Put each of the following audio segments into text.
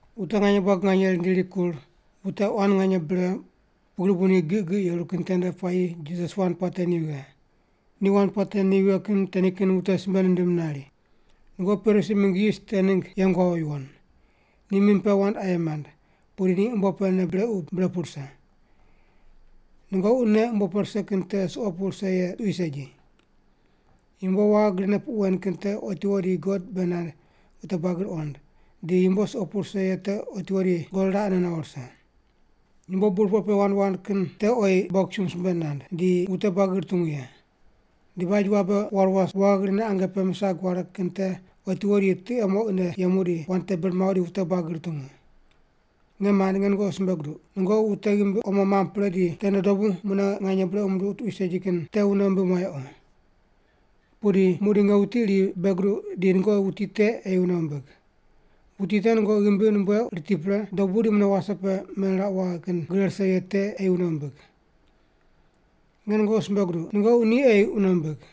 Wute nganye buagi nganye rindi rikur, wute quan nganye bre pugri bu ni giq giq yeru kin tende puayi Jisas wand puate ni vighe. Ni wand puate ni vighe kin te nikin wute simbe nindim nari, “Nungoqi Parisi mingg yis te ningg yeng wawo yuwon. Ni mim pe wand aye mand, pudi ni umbo pe nei brequ bre pu rise. Nungoqi nei umbo pe rise kin te suqo pu rise ye tuqui segi. Yumbo waghi grine puq wen kin te otiwo di God bei nand wute buagi ruqond, di yumbo suqo pu rise ye te otiwo di God raqene nawo rise. Yumbo burpoq pe wand wand kin te oyi bogisumb simbe nand, di wute buagi rutungu ye. Di baj wabe war was waghi grine ange pe misag ware kin te otiwo di tiqe moqine yemu di wand te bir mawo di wute buagi rutungu. “Nge mand, nge nungoqi simbe guduq, nungoqi wute ghimbi omo mamb pre di tende dobu mune nganye brequ munduq tuqui segi kin te wune wumbim wayequ. Pudi muqdi nge wuti iri bei guduq di nungoqi wuti te ei wune wumbig: Wuti te nungoqi ghimbi numbueuq riti pre, dobu di mune wase pe meniraqu waghe kin gre rise ye te ei wune wumbig. Nge nungoqi simbe guduq, nungoqi ni ei wune wumbig.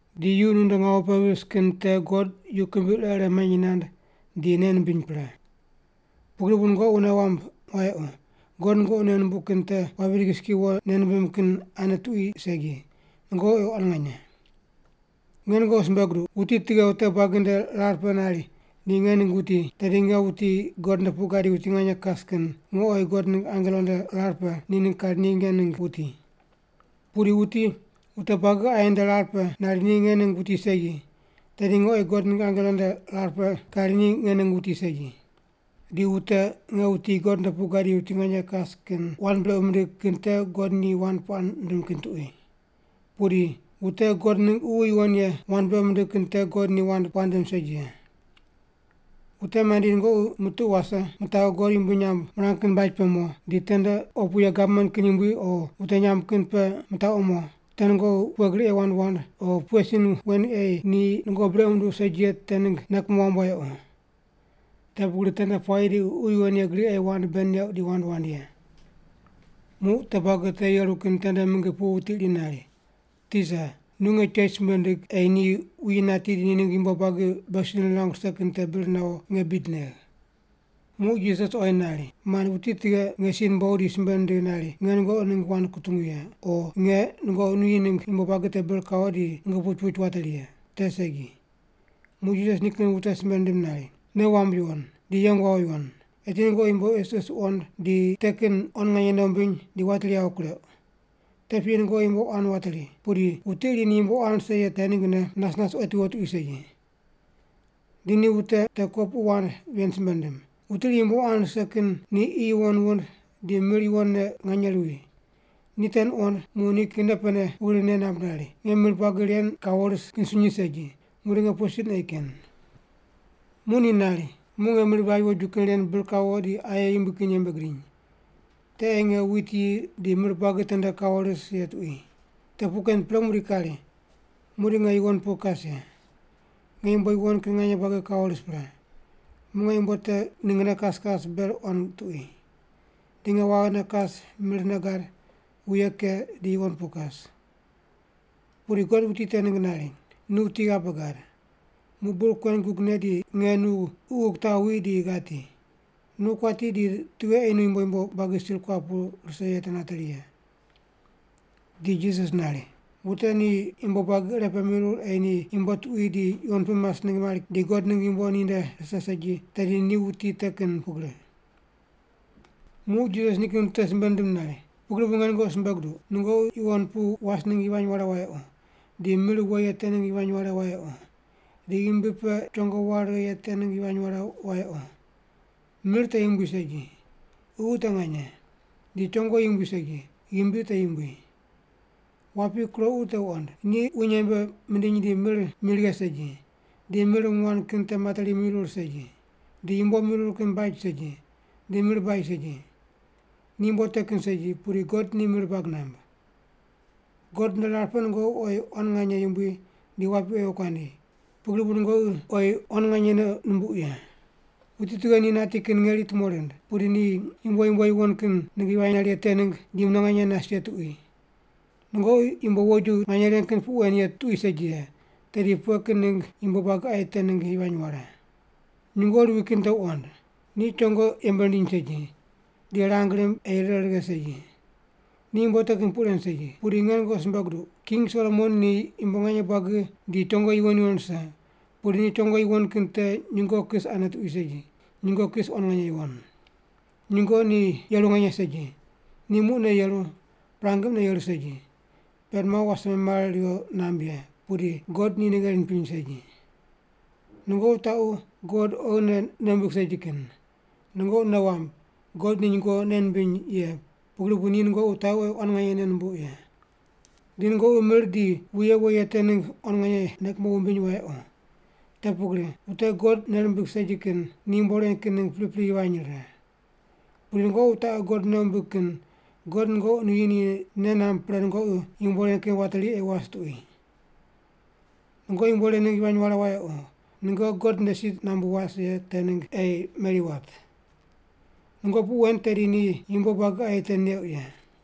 Di yu nunde ngawu pe vis kin te God yu kimbi ire ire manyi nand di nei nimbiny pre. Pugri bu nungoqi wune wamb wayequ, God nungoqi nei numbuq kin te wapi digiski wo nei nimbim kin ane tuqui segi, nungoqi oyi quan nganye. “Nge nungoqi simbe guduq, wuti tughe wute buagi nde rar pe nari ni nge ningg wuti, tedi nge wuti God nde pu gadi wuti nganye kas kin nge oyi God ningg angelo nde rar pe ni ningg kari ni nge ningg wuti. Pudi wuti wute buagi aye nde rar pe nari ni nge ningg wuti segi, tedi nge oyi God ningg angelo nde rar pe kari ni nge ningg wuti segi. Di wute nge wuti God nde pu gadi wuti nganye kas kin wand brequ mindigh kin te God ni wand puaq nindim kin tuqui. Pudi wute God ningg Ququ Yuwon Ye wand brequ mindig kin te God ni wand puaq nindim segi ye. “Wute mandi nungoqi mutuqu wase, mitaqu God yumbui nyamb mirang kin baj pe mo, di tende opu ye gavman kin yumbui o wute nyamb kin pe mitaqu mo, te nungoqi pughe gri ei wand wand o pughe sin wen ei ni nungoqi brequ munduq segi ye te ningg nei kumo wamb wayequ. Te pugri tende puayi di Ququ Yuwon Ye gri ei wand bei neuq di wand wand ye.” Muq wute buagi te yeru kin tende mingi pu wuti iri nari, “Tisa, nu nge chech simbe ndig ei ni wuyi nati di ni ningg yumbo buagi beghi si nirangu rise kin te bir nawo nge bid negh.” Muq Jisas oyi nari, “Mand, wuti tughe nge si numbogh di simbe nindigh nari nge nungoqi ningg wand kutungu ye, o nge nungoqi nuyi ningg yumbo buagi te bir kawo di nungoqi puch puch wateri ye? Te segi.” Muq Jisas nikin wute simbe nindim nari, “Nei wamb yuwon, di yeng wawo yuwon. Eti nungoqi yumbo isis wuqond di te kin quan nganye nei wumbiny di wateri yawo kureuq. Te piyi nungoqi yumbo quan wateri, pudi wuti iri ni yumbo quan rise ye te ninggne nas nas otiwo tuqui segi.” Di ni wute te kopuqu wand ven simbe nindim, “Wuti iri yumbo quan rise kin ni qi yuwon wund di mir yuwonne nganye ruwi. Ni te nuqond muq nikin nei pene pugri nei namb nari, ‘Nge mir buagi ren kawo ris kin sunyi segi. Muqdi nge pughe sin ei ken?’ “Muq ni nari, ‘Muq nge mir baj woju kin ren bir kawo di aye yumbui kin yembe gidiny. Te ei nge wit yi di mir buagi tende kawo ris ye tuqui. Te puq ken pre muqdi kari, muqdi nge yuwon pu kas ye, nge yumbo yuwon kin nganye buagi kawo ris pre. Muq nge yumbo te ninggne kas kas ber quan tuqui. Di nge waghine kas mirne gad, wuye ke, di yuwon pu kas.’ “Pudi God wuti te ningg nari, ‘Nu wuti ghabe gad! Muq bur kuen gugne di nge nu ququ kitaw wi di ghati. Nu kuati di tughe ei nu yumbo yumbo buagi sir kuap pu rise ye te nateri ye’?” Di Jisas nari, “Wute ni yumbo buagi irepe mirur ei ni yumbo tuqui di yuwon pu mas ningg mari di God ningg yumbo ninde rise segi tedi ni wuti te kin pugri.” Muq Jisas nikin wute simbe nindim nari, “Pugri bu nge nungoqi simbe guduq, nungoqi yuwon pu was ningg yivany ware wayequ, di mir we ye te ningg yivany ware wayequ, di ghimbi pe chongo ware righe ye te ningg yivany ware wayequ. Mir te yumbui segi, ququ te nganye. Di chongo yumbui segi, ghimbi te yumbui. Wapi kuroqu te wuqond. Ni wuny yembe mindiny di mir mi righe segi, di mir nguan kin te materi mirur segi. Di yumbo mirur kin baj segi, di mir baj segi. Ni yumbo te kin segi, pudi God ni mir bag namb. God nde rar pe nungoqi oyi quan nganye yumbui di wapi oyi wokuandi, pugri bu nungoqi oyi quan nganye nei numbuq ye. Wuti tughe ni nati kin ngeri tumo rind, pudi ni yumbo yumbo yuwon kin ningg yivany nare ye te ningg di mune nganye nas ye tuqui? Nungoqi yumbo woju nganye ren kin puq wen ye tuqui segi ye, tedi pughe kin ningg yumbo buagi aye te ningg yivany ware? “Nyungo ruwi kin te wuqond. Ni chongo yembe rindiny segi, di rang rimb ei rire righe segi. Ni yumbo te kin puq ren segi. Pudi nge nungoqi simbe guduq, King Solomon ni yumbo nganye buagi di chongo yuwon yuwon rise, pudi ni chongo yuwon kin te nyungo kis ane tuqui segi, nyungo kis quan nganye yuwon. Nyungo ni yeru nganye segi, ni muqne yeru, prangi mune yeru segi, pend mawo wase memare riwo namb ye, pudi God ni nei gheri nipiny segi. Nungoqi wutaqu God oghine nei wumbig segi kin! Nungoqi nei wamb, God ni nyungo nei nimbiny ye, pugri bu ni nungoqi wutaqu oyi quan nganye nei numbuq ye. Di nungoqi mir di wuye we ye te ningg quan nganye nei kumo wumbiny wayequ. Te pugri wute God nei rimbig segi kin ni yumbo ren kin ningg pripri yivany rire. Pudi nungoqi wutaqu God nei wumbig kin God nungoqi nuyi ni nei namb pre nungoqi yumbo ren kin wateri ei was tuqui. Nungoqi yumbo ren ningg yivany ware wayequ, nungoqi God nde si nambu was ye te ningg ei meri wat. Nungoqi puq wen tedi ni yumbo buagi aye te neuq ye.”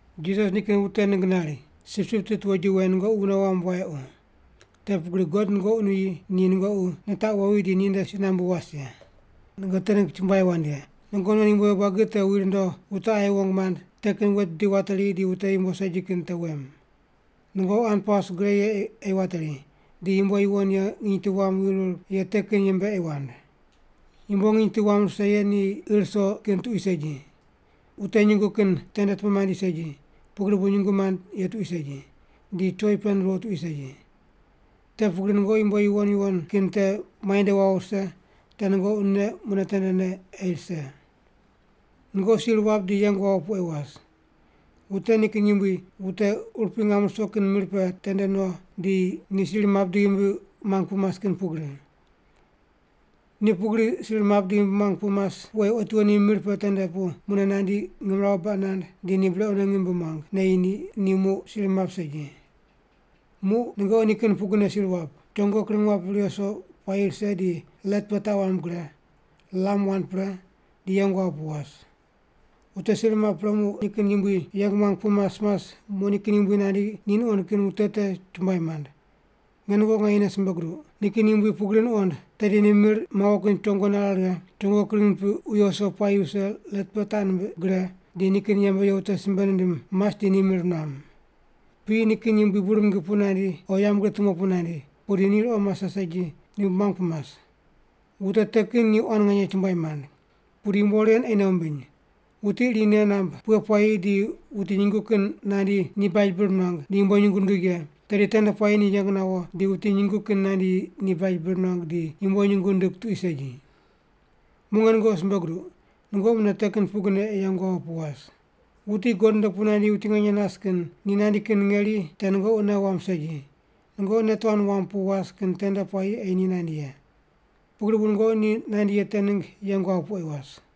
Jisas nikin wute ningg nari, “Sipsip tit woju wen nungoqi wune wamb wayequ. Te pugri God nungoqi nuyi ni nungoqi nitaqu wowi di ni nde si nambu was ye. Nungoqi te ningg chumbuai wand ye. Nungoqi non yumbo yumbo buagi te wi rundo wute aye wong mand, te kin wet bidi wateri di wute yumbo segi kin te wem. Nungoqi hanpaus gre ye ei wateri, di yumbo yuwon ye nginy tu wam wirur ye te kin yembe ei wand. Yumbo nginy tu wam rise ye ir ruso kin tuqui segi, wute nyungu kin tende tumo mandi segi, pugri bu nyungu mand ye tuqui segi, di choi pend ruwo tuqui segi. Te pugri nungoqi yumbo yuwon yuwon kin te muainde wawo rise te nungoqi nei mune tendene ei rise. “Nungoqi sir wap di yeng wawo pu ei was. Wute nikin yumbui wute urupui ngam ruso kin mir pe tende no di ni sir map di ghimbi muang pu mas kin pugri. Ni pugri sir map di ghimbi muang pu mas pu ei otiwo ni mir pe te pu mune nandi ngimrawu baq nand di ni brequne ngim bi muang, neyi ni, ni muq sir map segi. Muq nungoqi ni kin pugrine sir wap, chongo kring wap riwo ruso puayi rise di let pe taq wamb gre, lam wand pre, di yeng wawo pu was. Wute sir map pre muq nikin yumbui yeng muang pu mas mas muq nikin yumbui nandi ni nuqond kin wute te chumbuai mand. Nge nungoqi nganyene simbe guduq, nikin yumbui pugri nuqond, tedi ni mir mawo kin chongo nare righe, chongo kring nipiq wiyo wuso puayi wuse let pe taq nimbiq gre, di nikin yembe ye wute simbe nindim mas di ni mir nuam. Piyi nikin yumbui bur mingi pu nandi o yambgriq tumo pu nandi, pudi ni ruqo mase segi ni ghimbi muang pu mas. Wute te kin ni quan nganye chumbuai mand. Pudi yumbo ren ei nei wumbiny. Wuti iri ni nei namb pughe puayi di wuti nyungu kin nandi ni baj bir nuang di yumbo nyungu nand ye, tedi tende puayi ni yeng nawo di wuti nyungu kin nandi ni baj bir nuang di yumbo nyungu nindig tuqui segi. Muq nge nungoqi simbe guduq, nungoqi mune te kin pugrine ei yeng wawo pu was. Wuti God nde pu nandi wuti nganye nas kin ni nandi kin ngeri te nungoqi nei wamb segi, nungoqi nei tuan wamb pu was kin tende puayi ei ni nandi ye. Pugri bu nungoqi ni nandi ye te ningg yeng wawo pu ei was.”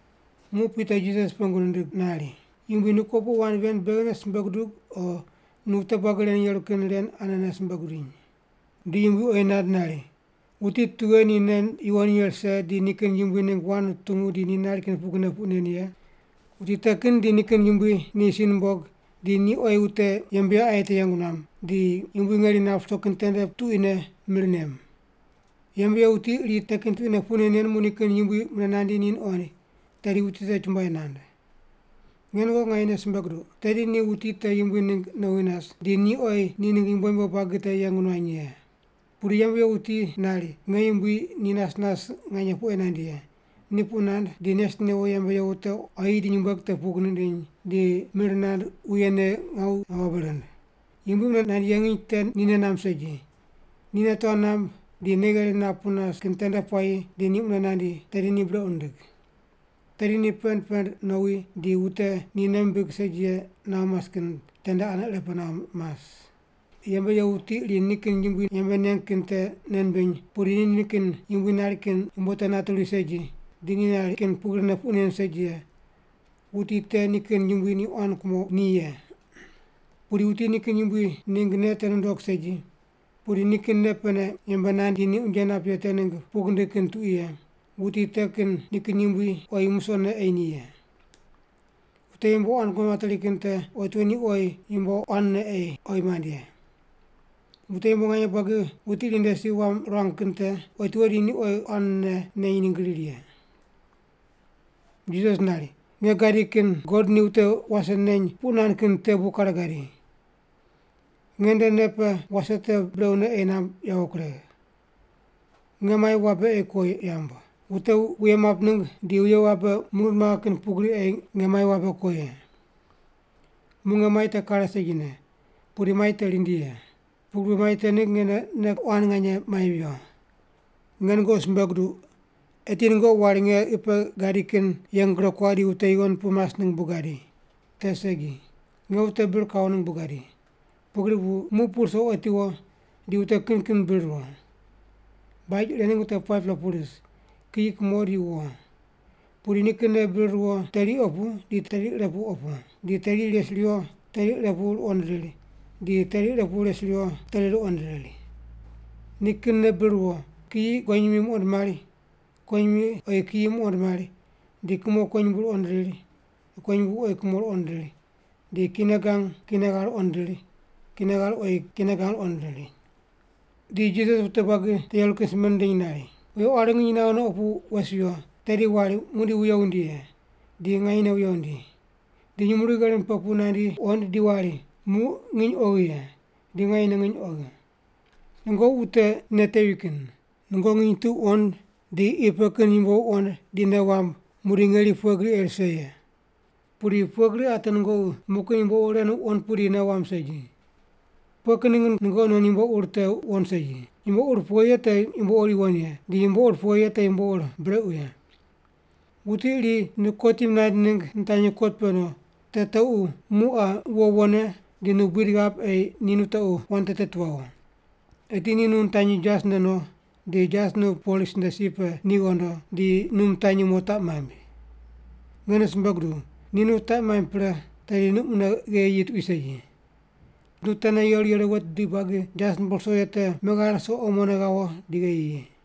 Muq Pita Jisas pengu nindig nari, “Yumbui, nu kopuqu wand ven beghine simbe gudug o nu wute buagi ren yeru kin ren anene simbe gudiny?” Di Yumbui oyi nand nari, “Wuti tughe ni nei yuwon ye rise di nikin yumbui ningg wand nutungu di ni nari kin pugrine puq nen ye? Wuti te kin di nikin yumbui ni si numbog, di ni oyi wute yembe ye aye te yeng nuam, di yumbui ngeri nap ruso kin tende tuquine mir nem. Yembe ye wuti iri te kin tuquine puq nen nen muq nikin yumbui mune nandi ni nuqoind, tedi wuti te chumbuai nand. Nge nungoqi nganyene simbe guduq, tedi ni wuti te yumbui ningg nowi nas, di ni oyi ni ningg yumbo yumbo buagi te yeng nuany ye. Pudi yembe ye wuti nari, ‘Nge yumbui ni nas nas nganye pu ei nandi ye.’ Ni puq nand di nes newo yembe ye wute quayi di nyumbueg te pug nindiny, di mir nand wuye ne ngawu ghabe rind. Yumbui mune nandi ye nginy te ni nei namb segi, ni nei tuan namb di nei gheri nap pu nas kin tende puayi di ni mune nandi, tedi ni brequ nindig. Tedi ni pend pend nowi, di wute ni nei mimbig segi ye nawo mas kin tende ane irepe nawo mas. “Yembe ye wuti iri nikin yumbui yembe neng kin te nei nimbiny, pudi ni nikin yumbui nari kin yumbo te nate ruwi segi, di ni nari kin pugrine puq nen segi ye, wuti te nikin yumbui ni quan kumo ni ye. Pudi wuti nikin yumbui ningg nei te nundog segi, pudi nikin nei pene yembe nand di unje nap, di ni unje nap ye te ningg pug nindig kin tuqui ye, wuti te kin nikin yumbui oyi musoqne ei ni ye. Wute yumbo quan kumo materi kin te otiwo ni oyi yumbo quanne ei oyi mand ye. Wute yumbo nganye buagi wuti iri nde si wam ruang kin te, otiwo di ni oyi quanne neny ningg riri ye.” Jisas nari, “Nge gadi kin God ni wute wase neny puq nand kin te bu kare gadi. Nge nde nei pe wase te brequne ei namb yawo kuregh. Nge mai wabe ei ko yamb. Wute wuye map ningg di wuye wabe murund maghe kin pugri ei nge mai wabe ko ye. Muq nge mai te kare segine, pudi mai te rindi ye. Pugri bu mai te ningg nge nei quan nganye mai viyo. Nge nungoqi simbe guduq, eti nungoqi wari nge qi pe gadi kin yeng gure kuaq di wute yuwon pu mas ningg bu gadi. Te segi. Nge wute bir kawo ningg bu gadi, pugri bu muq pu ruso otiwo di wute kin kin bir ruwo. Baj ire ningg wute 5-pela pu ris, kiyi, kumo di wo. Pudi nikinne bir ruwo teri opu di teri ire pu opu, di teri res riwo teri ire pu ruqond riri, di teri ire pu res riwo teri ruqond riri. Nikinne bir ruwo, kiyi kuwonyimi muqond mari, kuwonyimi oyi kiyi muqond mari, di kumo kuwonyumbu ruqond riri, kuwonyumbu oyi kumo ruqond riri, di kine gang kine ghar ruqond riri, kine ghar oyi kine gang ruqond riri.” Di Jisas wute buagi te yeru kin te simbe nindiny nari, “Wuye quari nginy naghe no opu wes wiyo, tedi wari muqdi wuye wundi ye, di nganyene wuye wundi. Di nyumurighi gherim pe pu nandi wuqoind di wari muq nginy oghi ye, di nganyene nginy oghi. Nungoqi wute nei tevi kin! Nungoqi nginy tu wuqond di qi pe kin yumbo wuqond di nei wamb muqdi ngeri pughe gri ei rise ye. Pudi pughe gri ate nungoqi muq kin yumbo ur ren wuqond pudi nei wamb segi? “Pughe kin ningg nungoqi nonne nungoqi non yumbo ur te wuqond segi, yumbo ur pughe ye te yumbo ur yuwon ye di yumbo ur pughe ye te yumbo ur brequ ye? Wuti iri nu kotim naind ningg nitanyi kot pe no, te tequ muq qa wo wone di nu buid ghap ei nu tequ wand te teti wawo. Eti ni nu nitanyi jas nde no, di jas nu polis nde si pe ni ghondo, di nu mitanyi mo taq maimb. Nge nu simbe guduw, ni nu taq maimb pre tedi nu mune gheyi yi tuqui segi. Nu tene yeru yeru wet bidi buagi jas nupuw ruso ye te meghare ruso omone ghawo di gheyi yi.”